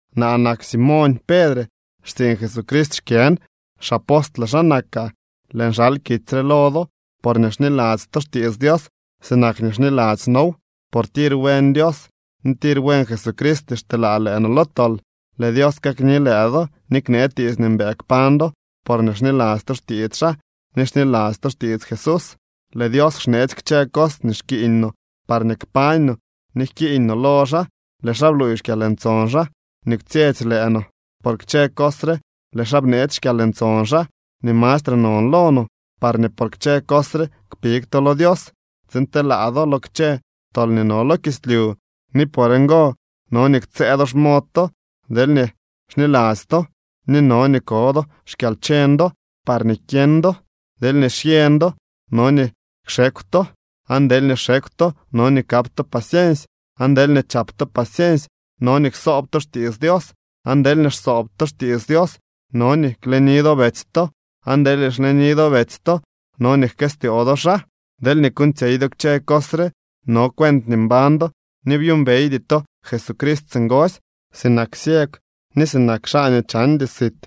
Naa nak Simoñ Pedre. Xtsiiñ Jesucrist xkyën, xapostle xaa nakaa. Lëën xal kitsy re lo do porñee xniladzy to xtiits Dios sinak nii xniladzy noow, por tir buen Dios ni tir buen Jesucrist nii xteelaa lëë no lo tol. Lëë Dios kakni lëë do ni knee tiits nii mbëë kpañ do, porñee xniladzy to xtiits xaa ni xniladzy to xtiits Jesús. Lëë Dios xneetsy kchë cos nii xkiiñ no parñee kpañ no ni jkiiñ no lo xaa. Lëë xaa bluuy xkyalntson xaa nii kwtsyetsy lëë no. Por kchë cos re lëë xaa bneetsy xkyalntson xaa nii mastre non lo no, parñee por kchë cos re kpig to lo Dios tsiin telaa do lo kchë tol nii no lo kislyu. Ni por ngo no nii ktsëë do xmod to deelñee xniladzy to, ni no nii ko do xkyalcheñ do parñee kyeñ do. Deelñee xyeñ do, no nii kxekw to, aan deelñee xekw to, no nii kap to paciensy, aan deelñee chap to paciensy, no nii ksoob to xtiits Dios. Aan deelñee xsoob to xtiits Dios, no nii kleni do betsy to, aan deelñee xleni do betsy to, no nii jkëstyoo do xaa. Deelñee kuuñtsyey do kchë cos re, no cuent nii mbañ do ni byuumbeydy to Jesucrist singosy. Sinak ciegw ni sinak xaa nii chandy sit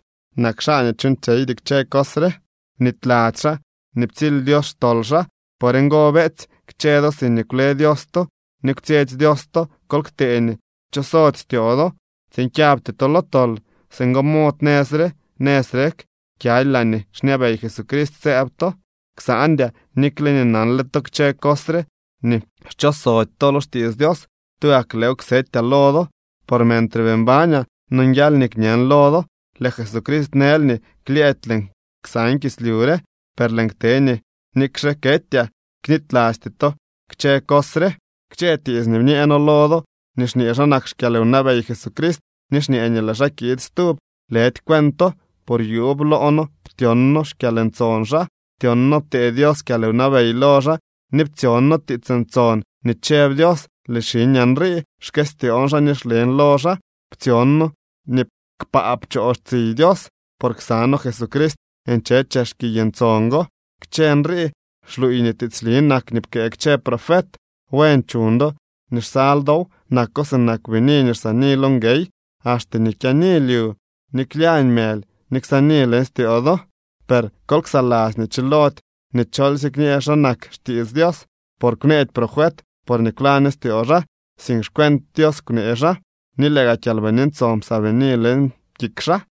nak xaa nii chuuñtsyeydy kchë cos re, bnityladzy xaa nii ptsily Dios xtol xaa. Por ngo, beetsy, kchë do siñee kwle Dios to ni kwtsyetsy Dios to, kol ktee nii kchosody styoo do, tsiin kyabty to lo tol. Singo mod nëz re nëz rek kyaly laañee xñabey Jesucrist sëëb to. Ksandyaa, nikle nii nanle to kchë cos re ni xchosody to lo xtiits Dios. Tugak lëëw ksetyaa lo do. Por mentre bii mbañaa, nonguial nii kñen lo do. Lëë Jesucrist nël nii klyëëdy lëën ksaan kislyu re. Per lëën kte nii nikxe ketyaa knitylasty to kchë cos re. Kchë tiits nii bñee noo lo do nii xñee xa nak xkyalwnabey Jesucrist ni xñee nii lëë xaa kiid stub, lëdy cuento. Por yuub loo noo ptyon noo xkyalntson xaa. Ptyon noo ptee Dios kyalwnabey lo xaa ni ptsyon noo tiits ntson nii chëb Dios: “Lëë xiñaa nrii. Xkëstyoon xaa ni xlen lo xaa.” Ptsyon noo nii kpaa pchoo tsiy Dios, por ksa noo Jesucrist nche chex kiy ntson go. Kchë nrii xluuy nii tiitsli nak nii pkëë kchë profet. Buen chuñ do nii xsal dow. Nako sinak bini nii xsaani lo nguey, axte nii kyaani lyu, ni klyañ mëly nii ksaani leñ styoo do. Per kol ksaladzy nii chilody nii cholsye kñee xa nak xtiits Dios. Por kwneedy profet porñee kwlaño styoo xaa, sink xcuent Dios kwnee xaa, ni lëë gaa Kyalbini Ntson psaabini leñ kik xaa.